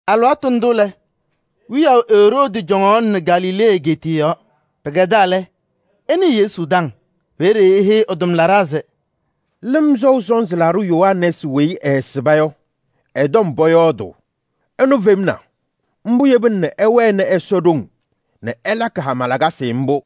Alɩwaatʋ ndʋ lɛ, wiyaʋ Eroodi cɔŋaɣnɩ Galilee egeetiye yɔɔ. Pɩkɛdaa lɛ, ɛnɩɩ Yesu taŋ. Peeye eheyi ɛ-tʋmlaɖaa se: “Lɩm Sɔʋ Sɔnzɩ Laɖʋ Yohanɛɛsɩ weyi ɛɛsɩba yɔ, ɛ-tɔm pɔyɔɔdʋʋ, ɛnʋ femna. Mbʋ yebina nɛ ɛwɛnɩ Ɛsɔ ɖoŋ nɛ ɛlakɩ hama lakasɩ mbʋ.”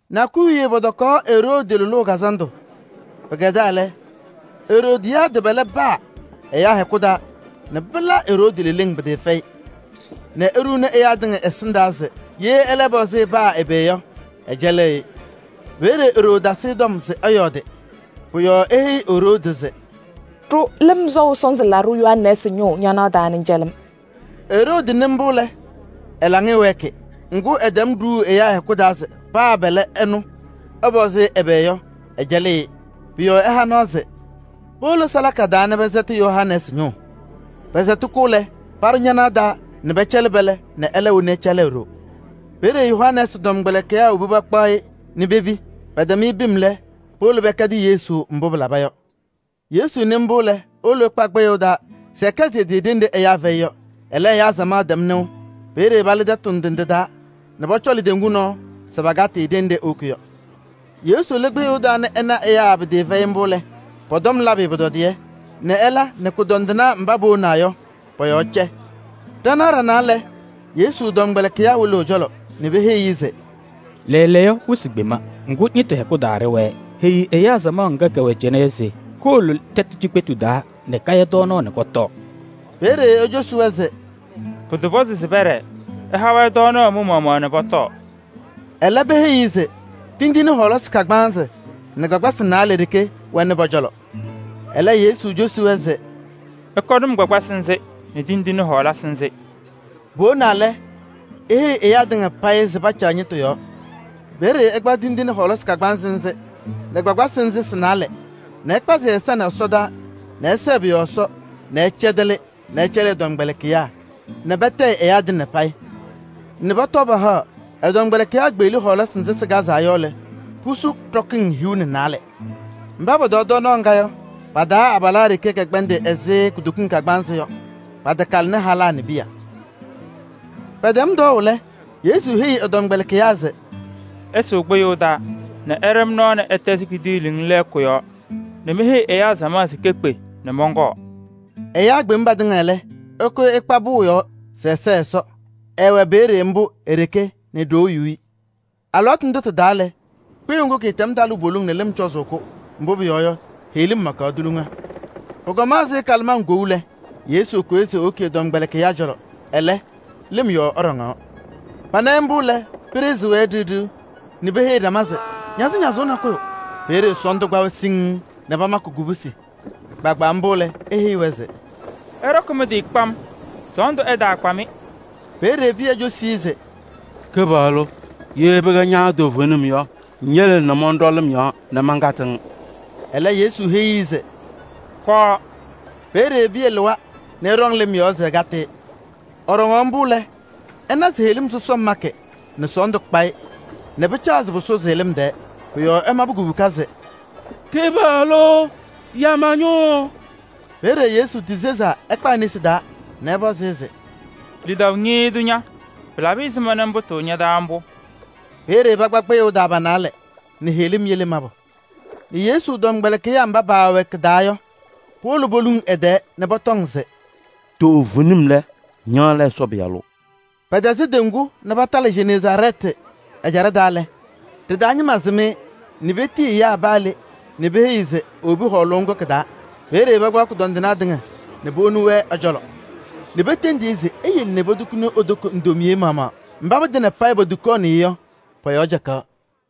Nakʋyʋ wiye pɔtɔkaɣ Eroodi lʋlʋʋ kazandʋ. Pɩkɛdaa lɛ, Eroodiyaadɩ pɛlɛ paa ɛyaa hɛkʋ taa nɛ pɩla Eroodi leleŋ pɩtɩɩfɛyɩ nɛ eɖuu ɛyaa tɩŋa ɛsɩndaa se ye ɛlɛ ɛpɔzɩ-ɩ paa ɛbɛ yɔ, ɛcɛlɩɣ-ɩ. Peeye e-ɖoo tasɩ-ɩ tɔm. Pʋ-yɔɔ eheyi Eroodi se: “Ɖʋ Lɩm Sɔʋ Sɔnzɩ Laɖʋ Yohanɛɛsɩ ñʋʋ ñanaɣ taa nɛ ŋcɛlɩ-m.” Eroodi nɩ mbʋ lɛ, ɛ-laŋɩyɛ wɛɛkɩ. Ŋgʋ, ɛtɛm ɖuuu ɛyaa hɛkʋ taa se paa pɛlɛ ɛnʋ ɛpɔzɩ-ɩ ɛbɛ yɔ, ɛcɛlɩɣ-ɩ. Pʋ-yɔɔ ɛha nɔɔ se powolo salaka taa nɛ pɛsɛtɩ Yohanɛɛsɩ ñʋʋ. Pɛsɛtɩ-kʋ lɛ, paɖʋ ñanaɣ taa nɛ pɛcɛlɩ pɛlɛ nɛ ɛlɛ woni ɛcɛlɩ e-ɖoo. Peeye Yohanɛɛsɩ tɔmkpɛlɩkɩyaa wobi pakpaɣ-ɩ nɛ pepi. Pɛtɛm-ɩ pim lɛ, powolo pɛkɛdɩ Yesu mbʋ pɩlaba yɔ. Yesu nɩ mbʋ lɛ, ewolo ɛkpa kpɩyʋʋ taa se ɛkɛsɩ ɛ-tɩ ɖenɖe ɛyaa fɛyɩ yɔ. Ɛlɛ, ɛyaa samaɣ tɛm nɩʋ. Peeye palɩ tɛtʋ ndɩ ndɩ taa nɛ pɔcɔlʋʋ teŋgu nɔɔ se pakatɩ-ɩ ɖenɖe ewoki yɔ. Yesu lɩ kpɩyʋʋ taa nɛ ɛna ɛyaa pɩtɩɩfɛyɩ mbʋ lɛ, pɔ-tɔm labɩ-ɩ pʋtɔdɩyɛ nɛ ɛla nɛ kʋdɔndɩnaa mba powonaa yɔ, pɔ-yɔɔ cɛ. Ɖanaɣ ɖanaa lɛ, Yesu tɔmkpɛlɩkɩyaa wolo ɛ-cɔlɔ nɛ peheyi-i se: “Lɛɛlɛɛyɔ, wɩsɩ kpema. Ŋgʋ, ñɩtʋ hɛkʋ taa ɖɩwɛɛ. Heyi ɛyaa samaɣ ŋga kɛwɛ cɩnɛ yɔ se kowolo tɛtʋ cikpetu taa nɛ kaya tɔɔnaɣ nɛ kɔtɔɔ.” Peeye ecosi-wɛ se: “Pɩtɔpɔzɩ se pɛɖɛɛ. Ɩha-wɛ tɔɔnaɣ mɩ-maɣmaɣ nɛ pɔtɔɔ.” Ɛlɛ peheyi-i se tindine kagbaanzɩ nɛ kpakpasɩ naalɛ ɖeke wɛnɩ pɔ-cɔlɔ. Ɛlɛ cosi-wɛ se: “Ɩkɔnɩ-m kpakpasɩ nzɩ nɛ tindine ana.” Powonaa lɛ, eheyi ɛyaa tɩŋa payɩ se pacaɣ ñɩtʋ yɔɔ. Peeye ɛkpaɣ tindine ana a-kagbaanzɩ nɛ kpakpasɩ nzɩ sɩ-naalɛ nɛ ɛkpazɩ ɛ-ɛza ɛsɔdaa nɛ ɛsɛɛ pʋ-yɔɔ Ɛsɔ nɛ ɛcɛdɛlɩ nɛ ɛcɛlɩ ɛ-tɔmkpɛlɩkɩyaa nɛ patayɩ ɛyaa tɩŋa payɩ nɛ pɔtɔɔ pahaɣ. Ɛ-tɔmkpɛlɩkɩyaa kpeɣli hɔɔlasɩ nzɩ sɩkazaa yɔ lɛ, pusu ɖɔkɩŋ hiu nɛ naalɛ. Mba pɔtɔɔ tɔɔnaɣ ŋga yɔ, abalaa ɖeke kɛkpɛndɩ ɛzɩ kutokiŋ kagbaanzɩ yɔ. Patakalɩnɩ halaa nɛ piya. Pɛtɛm tɔɔʋ lɛ, Yesu heyi ɛ-tɔmkpɛlɩkɩyaa se: “Ɩsʋʋ kpɩyʋʋ taa nɛ ɩɖɛ-m nɔɔ nɛ ɩtɛzɩ kidiiliŋ lɛɛkʋ yɔɔ nɛ meheyi ɛyaa samaɣ se kekpe nɛ mɔnkɔɔ.” Ɛyaa kpem patɩŋa lɛ, ɛkʋyɩ ɛkpa pʋʋ yɔɔ se ɛsɛɣ Ɛsɔ. Ɛɛwɛ peeye mbʋ e-ɖeke nɛ ɖoo yu-i. Alɩwaatʋ ndʋ tɩ-taa lɛ, kpɩyʋʋ ŋgʋ kɩtɛm talʋʋ poliŋ nɛ lɩm cɔzʋʋ-kʋ, mbʋ pʋyɔɔ yɔ, heɣlim makaɣ tuliŋa. Pʋkɔma ɛzɩ kalɩmaŋ kou yɔ lɛ, Yesu kʋyɩ se ewoki ɛ-tɔmkpɛlɩkɩyaa cɔlɔ, ɛlɛ, lɩm yɔɔ ɛɖɔŋaɣ. Pana-ɩ mbʋ lɛ, pɩɖɩɣzɩ-wɛ yem ɖɩɣ ɖɩɣ nɛ peheyiɣ ɖama se ñazɩñazʋʋ nakʋyʋ! Peeye sɔɔndʋ kpa-wɛ siŋŋ nɛ pamakɩ kubusi. Kpaagbaa mbʋ lɛ, eheyi-wɛ se: “Ɩɖɔkɩ mɩ-tɩ kpam, sɔɔndʋ ɛtaakpa-mɩ, ma.” Peeye Pɩyɛ cosi-i se: “Kɩpaɣlʋ! Ye pɩkɛ ña toovenim yɔ, ŋyele nɛ mɔnɖɔ lɩm yɔɔ nɛ mankatɩ-ŋ.” Ɛlɛ, Yesu heyi-i se: “Kɔɔ!” Peeye Pɩyɛ lɩwa nɛ ɛɖɔŋ lɩm yɔɔ se ɛkatɩ-ɩ. Ɛɖɔŋaɣ mbʋ lɛ, ɛna se heɣlim makɩ sɔsɔm nɛ sɔɔndʋ kpa-ɩ nɛ pɩcaɣ se pʋsʋzɩ-ɩ lɩm tɛɛ. Pʋ-yɔɔ ɛmabɩ kubuka se: “Kɩpaɣlʋ! Ya ma-ñʋʋ!” Peeye Yesu tisezaa ɛkpa e-nesi taa nɛ ɛpɔzɩ-ɩ se: “Lidaʋ ñɩɩɩ tʋ ña! Pɩlabɩ ɛzɩma nɛ ŋpʋtʋʋ ña-taa mbʋ?” Peeye pakpa kpɩyʋʋ taa pa-naalɛ nɛ heɣlim yele mabʋ nɛ Yesu tɔmkpɛlɩkɩyaa mba paawɛ kɩ-taa yɔ, powolo poluŋ ɛ-tɛɛ nɛ pɔtɔŋ se: “Toovenim lɛ, ña lɛ Ɛsɔ Pɩyalʋ!” Pɛtɛzɩ teŋgu nɛ patalɩ Jeneezaarɛɛtɩ ɛjaɖɛ taa lɛ, ɖɩ-taa ñɩma sɩm-ɩ nɛ petiyi ɛyaa paa le nɛ peheyi se ewobi hɔɔlʋʋ ŋgʋ kɩ-taa. Peeye pakpaɣ kʋdɔndɩnaa tɩŋa nɛ powoni-wɛ ɛ-cɔlɔ nɛ petendiɣ-i se eyele nɛ potukuni e-toko ndomiye maɣmaɣ. Mba patɩŋa payɩ potukaɣnɩ-ɩ yɔ, pɔ-yɔɔ cɛkaɣ.